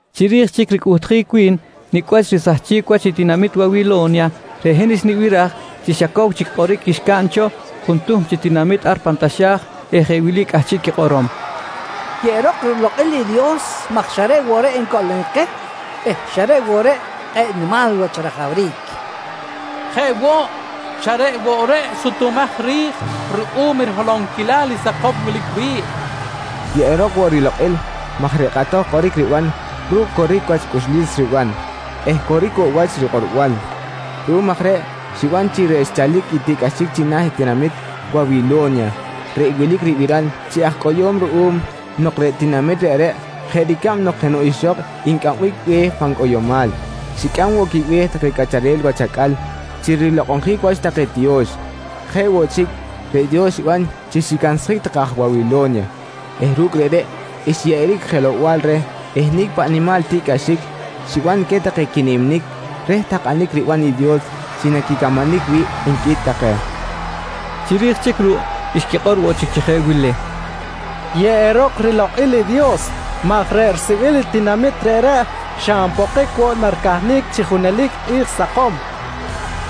Chiri̱j chic ricꞌuhtjic wi̱n nicꞌ wach risahchic wach i tinamit Wawilo̱nya, reꞌ hin xnibiraj chi xa cow chic kꞌoric xcaꞌn cho juntuhm chi tinamit ar pan taxa̱j eh jeꞌ wili cꞌahchiꞌ quikꞌorom: «Yeꞌerok rilokꞌil i Dios maj xa reꞌ woꞌ reꞌ ncoꞌlonic keh eh xa reꞌ woꞌ reꞌ kꞌe̱ꞌ nimal wach rajawric. Jeꞌ woꞌ, xa reꞌ woꞌ reꞌ sutumaj ri̱j ruꞌum i riholonquilal i sakom wilic wi̱ꞌ. Yeꞌerok woꞌ rilokꞌil maj reꞌ kꞌatoj kꞌoric riban ru̱cꞌ coric wach cꞌuxlis riban eh coric woꞌ wach rikꞌorbal. Ruꞌum aj reꞌ xiban chi xchalic i tiꞌcꞌaxic china̱ i tinamit Wawilo̱nya reꞌ wilic ribiral chi aj cꞌoyo̱m ruꞌum nok reꞌ tinamit reꞌreꞌ jeꞌ ricab nok jenoꞌ ixok ncꞌambic be̱h pan cꞌoyomal, xicꞌam woꞌ quibe̱h take cꞌacharel wach acꞌal chi rilokꞌonjic wach take tiyo̱x. Jeꞌ woꞌ chic reꞌ Dios xiban chi xicansjic take aj Wawilo̱nya eh ru̱cꞌ reꞌreꞌ xyeꞌeric jelow-bal reh i nicꞌ paꞌ nimal tiꞌcꞌaxic xiban queh take quiniminic reh takꞌanic ribanam i Dios chi naquicamanic wi̱ꞌ, nqui take. Chiri̱j chic ruꞌ xquikꞌor woꞌ chic chi jeꞌ wili: «Yeꞌerok rilokꞌil i Dios maj reꞌ risibil i tinamit reꞌreꞌ xa npokic woꞌ naricahnic chi junelic i kꞌi̱j sakom, nqui take.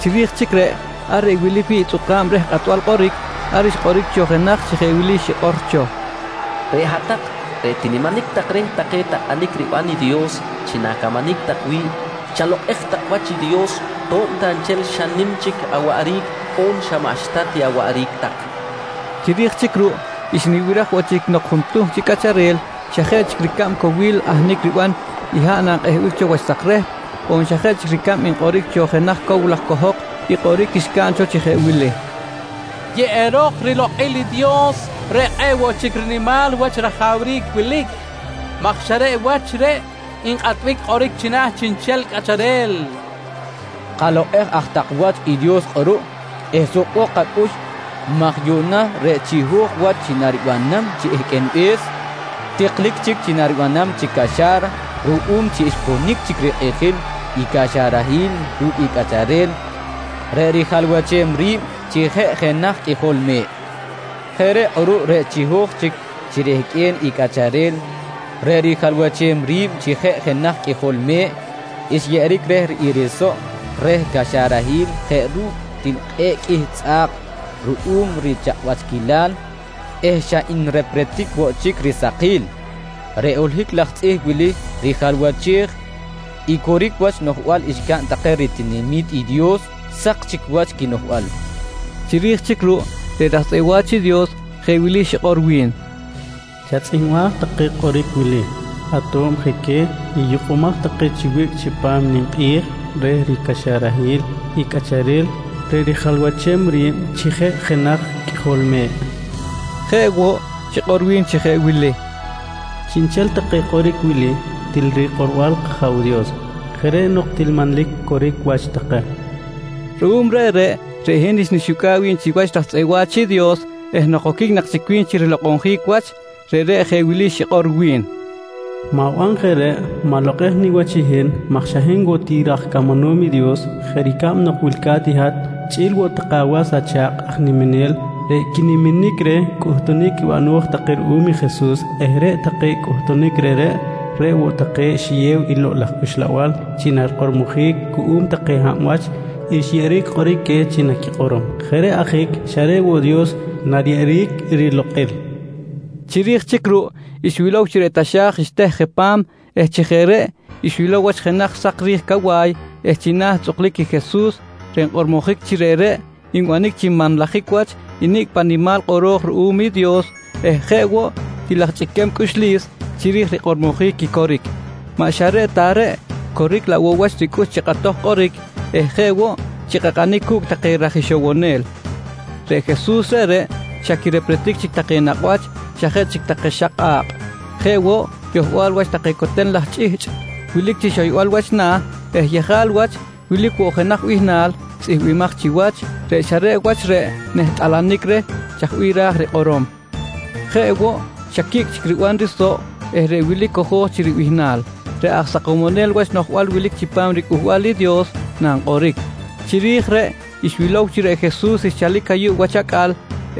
Chiri̱j chic reꞌ, ar reꞌ wilic wi̱ꞌ i tzꞌuka̱b reh kꞌatbal kꞌoric, ar xkꞌoric cho jenaj chi jeꞌ wili xikꞌor cho: «Reꞌ hat-tak reꞌ tiniminic tak reh take takꞌanic ribanam i Dios chi na̱camanic tak wi̱ꞌ, chalokꞌej tak wach i Dios to̱b ta nchel xa nim chic awaꞌric on xa maꞌxta ti awaꞌric tak, nqui. Chiri̱j chic ruꞌ xnibiraj woꞌ chic nok juntuhm chi cꞌacharel xa jeꞌ chic ricab cowil ahnic riban i haꞌ nankꞌehbic cho wach sak rehp on xa jeꞌ chic ricab nkꞌoric cho jenaj cow laj cohok i kꞌoric xcaꞌn cho chi jeꞌ wili: «Yeꞌerok rilokꞌil i Dios reꞌ kꞌe̱ꞌ woꞌ chic rinimal wach rajawric wilic maj xa reꞌ wach reꞌ nkꞌatbic kꞌoric china̱ chiꞌnchel cꞌacharel. Kalokꞌej aj tak wach i Dios kꞌuruꞌ eh sukbok kacꞌux maj yuꞌna reꞌ chiho̱j wach chi naribanam chi ehqꞌuenbe̱s, tiklic chic chi naribanam chic caxa̱ra ruꞌum chi xponic chic rikꞌijil i caxarahil ru̱cꞌ i Cꞌacharel reꞌ rijalwachem ri̱b chi jeꞌ jenaj Qꞌuijol Me̱ꞌ. Jeꞌ reꞌ kꞌuruꞌ reꞌ chiho̱j chic chi rehqꞌue̱n i Cꞌacharel reꞌ rijalwachem ri̱b chi jeꞌ jenaj Qꞌuijol Me̱ꞌ xyeꞌeric reh i risoꞌ reh caxarahil jeꞌ ru̱cꞌ til kꞌe̱ꞌ qꞌuih tzꞌa̱k ruꞌum richakꞌwachquilal eh xa nrepretic woꞌ chic risakil. Reꞌ holohic laj tzꞌih wili rijalwachej i coric wach noꞌjbal xcaꞌn take ritinami̱t i Dios sak chic wach quinoꞌjbal, nqui take. Chiri̱j chic ruꞌ reꞌ raj tzꞌeꞌ wa̱ch i Dios jeꞌ wili xikꞌor wi̱n: «Chatzꞌihmbaj take kꞌoric wili: Ato̱b je queh i yukꞌumaj take chi wiꞌc chipam i ninkꞌi̱j reh ricaxarahil i Cꞌacharel reꞌ rijalwachem ri̱b chi jeꞌ jenaj Qꞌuijol Me̱ꞌ, nqui xikꞌor wi̱n. Jeꞌ woꞌ xikꞌor wi̱n chi jeꞌ wili: «Chiꞌnchel take kꞌoric wili, til rikꞌorbal i kAja̱w Dios. Jeꞌ reꞌ nok til manlic coric wach take, nqui woꞌ wi̱n. Ruꞌum reꞌreꞌ, reꞌ hin xnixucꞌa̱ꞌ wi̱b chiwach raj tzꞌeꞌ wa̱ch i Dios eh nok oquic nak chic wi̱n chi rilokꞌonjic wach, reꞌreꞌ jeꞌ wili xikꞌor wi̱n: «Ma̱ban jeꞌ reꞌ! Ma̱lokꞌej niwach i hin maj xa hin woꞌ ti raj camanom i Dios jeꞌ ricab nok wilca̱t i hat chꞌi̱l woꞌ take awas acha̱kꞌ aj niminel reꞌ quiniminic reh cꞌuhtunic bano̱j take ruꞌum i Jesus eh reꞌ take cꞌuhtunic reꞌreꞌ, reꞌ woꞌ take xiyew i Lokꞌ laj Uxlabal chi narikꞌormojic cuꞌum take hab wach xyeꞌeric kꞌoric queh chi naquikꞌorom. Jeꞌ reꞌ ajic xa reꞌ woꞌ Dios nariyeꞌeric rilokꞌil, nqui xikꞌor wi̱n. Chiri̱j chic ruꞌ xwilow chi reꞌ taxa̱j xteh je pa̱m eh chi jeꞌ reꞌ xwilow wach jenaj sak ri̱j cawa̱y eh china̱ tzꞌuklic i Jesus reꞌ nkꞌormojic chi reꞌreꞌ nbanic chi nmanlajic wach i nicꞌ paꞌ nimal kꞌoro̱j ruꞌum i Dios eh jeꞌ woꞌ til aj chꞌiquem cꞌuxlis chiri̱j i rikꞌormojic i coric. Maꞌ xa reꞌ ta reꞌ, coric laꞌ woꞌ wach ricꞌux chi kꞌatoj kꞌoric eh jeꞌ woꞌ chi kꞌakꞌanic cu̱cꞌ take raj ixowonel. Reꞌ Jesus reꞌreꞌ xa quirepretic chic take nakꞌ wach xa jeꞌ chic take xak kꞌa̱kꞌ. Jeꞌ woꞌ yohbal wach take coten laj chꞌihchꞌ wilic chi xoybal wach na̱ eh yejal wach wilic woꞌ jenaj bihnal tzꞌihmbimaj chiwach, reꞌ xa reꞌ wach reꞌ nehtꞌalanic reh chaj bih ra̱j rikꞌorom. Jeꞌ woꞌ xa quicꞌ chic riban risoꞌ eh reꞌ wili cojo̱j chi ribihnal: “Reꞌ aj Sakomonel Wach Noꞌjbal wilic chipam riCꞌuhbal i Dios”, nankꞌoric. Chiri̱j reꞌ xwilow chi reꞌ Jesus xchalic ayuꞌ wach acꞌal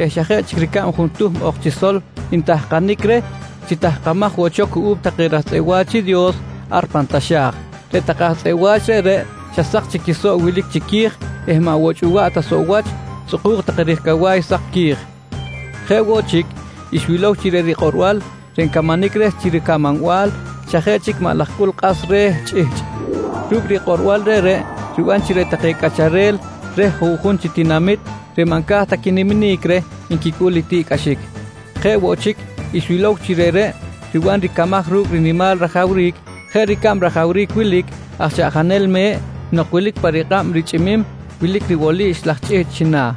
eh xa jeꞌ chic ricab juntuhm ok chi sol ntahkanic reh, chi tahkamaj woꞌ cho cuꞌum take raj tzꞌeꞌ wa̱ch i Dios aj pan taxa̱j. Reꞌ take aj tzꞌeꞌ wa̱ch reꞌreꞌ xa sak chic i quisoꞌ wilic chiqui̱j eh maꞌ woꞌ chꞌuwaꞌ ta soꞌ wach, tzꞌukuk take ri̱j cawa̱y sak qui̱j. Jeꞌ woꞌ chic, xwilow woꞌ chi reꞌ rikꞌorbal reꞌ ncamanic reh chi ricamanbal, xa jeꞌ chic maꞌ laj cꞌul kꞌas re̱ chꞌihchꞌ. Ru̱cꞌ rikꞌorbal reꞌreꞌ riban chi reꞌ take cꞌacharel reh juꞌjun chi tinamit reꞌ maꞌ nca̱j ta quiniminic reh nquicꞌul i tiꞌcꞌaxic. Jeꞌ woꞌ chic, xwilow woꞌ chi reꞌreꞌ riban ricamaj ru̱cꞌ rinimal rajawric jeꞌ ricab rajawric wilic aj chaꞌjanel me̱ꞌ nok wilic pa rikꞌab richꞌimim wilic ribolix laj chꞌihchꞌ china̱.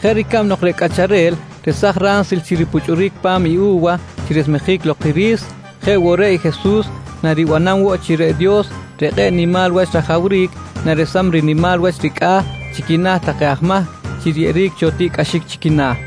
Jeꞌ ricab nok reꞌ cꞌacharel resaj ransil chi ripuchꞌuric pa̱m i u̱wa chi resmejic lok i ri̱s, jeꞌ woꞌ reꞌ i Jesus naribanam woꞌ chi reꞌ Dios reꞌ kꞌe̱ꞌ nimal wach rajawric, naresam rinimal wach ricꞌa̱ chi quina̱ take aj mahc chi riyeꞌeric cho tiꞌcꞌaxic chi quina̱.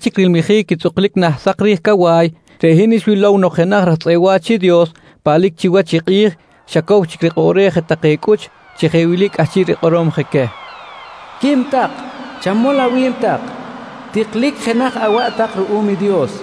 Chiri̱j chic rilmijic i tzꞌuklic nah sak ri̱j cawa̱y, reꞌ hin xwilow nok jenaj raj tzꞌeꞌ wa̱ch i Dios paꞌlic chiwach i kꞌi̱j, xa cow chic rikꞌoꞌrej je take cꞌuch chi jeꞌ wili cꞌahchiꞌ rikꞌorom je queh: «Quim tak. Chamol awi̱b tak. Tiklic jenaj awaꞌ tak ruꞌum i Dios.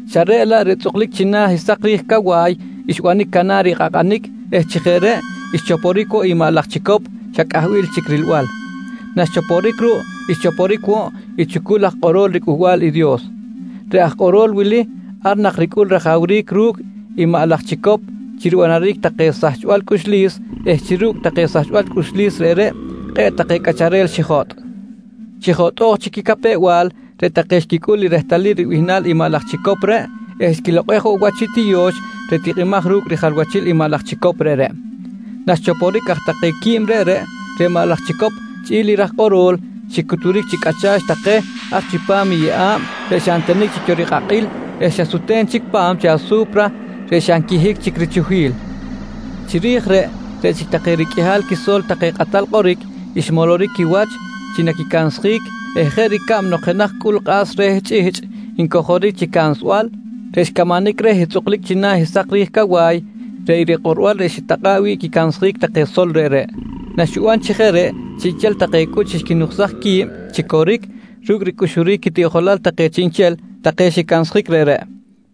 Xa reꞌ laꞌ reꞌ tzꞌuklic china̱ i sak ri̱j cawa̱y xbanic canar i kꞌakꞌanic eh chi jeꞌ reꞌ xchoporic woꞌ i maꞌ laj chicop xa cꞌahbil chic rilbal. Naxchoporic ruꞌ, xchoporic woꞌ i chucul aj kꞌorol riCꞌuhbal i Dios. Reꞌ aj kꞌorol wili ar nak ricꞌul rajawric ru̱cꞌ i maꞌ laj chicop chi ribanaric take sahchbal cꞌuxlis eh chi ru̱cꞌ take sachbal cꞌuxlis reꞌreꞌ kꞌe̱ꞌ take cꞌacharel xijotꞌ. Chi jotꞌo̱j chic quicapew-bal, reꞌ take reꞌ xquicꞌul i rehtalil ribihnal i maꞌ laj chicop eh xquilokꞌej woꞌ wach i tiyo̱x reꞌ tikꞌimaj ru̱cꞌ rijalwachil i maꞌ laj chicop reꞌreꞌ. Naxichoporic aj take quib reꞌreꞌ, reꞌ maꞌ laj chicop chꞌi̱l i raj kꞌorol, xicuturic chi cꞌacha̱ch take ar chipam i yeꞌa̱b reꞌ xa ntenic chic cho rikꞌakꞌil eh xa sute̱n chic pa̱m chi asu̱pra reꞌ xa nquihic chic richuhil. Chiri̱j reꞌ, reꞌ chic take riqꞌuihal quiso̱l take kꞌatal kꞌoric xmoloric quiwach chi naquicansjic eh jeꞌ ricab nok jenaj cꞌul kꞌas reh chꞌihchꞌ ncojoric chi cansbal, reꞌ xcamanic reh i tzꞌuklic china̱ i sak ri̱j cawa̱y, reꞌ i rikꞌorbal reꞌ xitakꞌa̱ꞌ wi̱ꞌ quicansjic take sol reꞌreꞌ. Naxiban chi jeꞌ reꞌ, chiꞌnchel take cꞌuch xquinuksaj qui̱b chi coric ru̱cꞌ ricꞌuxuric quitiꞌjolal take chiꞌnchel take xicansjic reꞌreꞌ.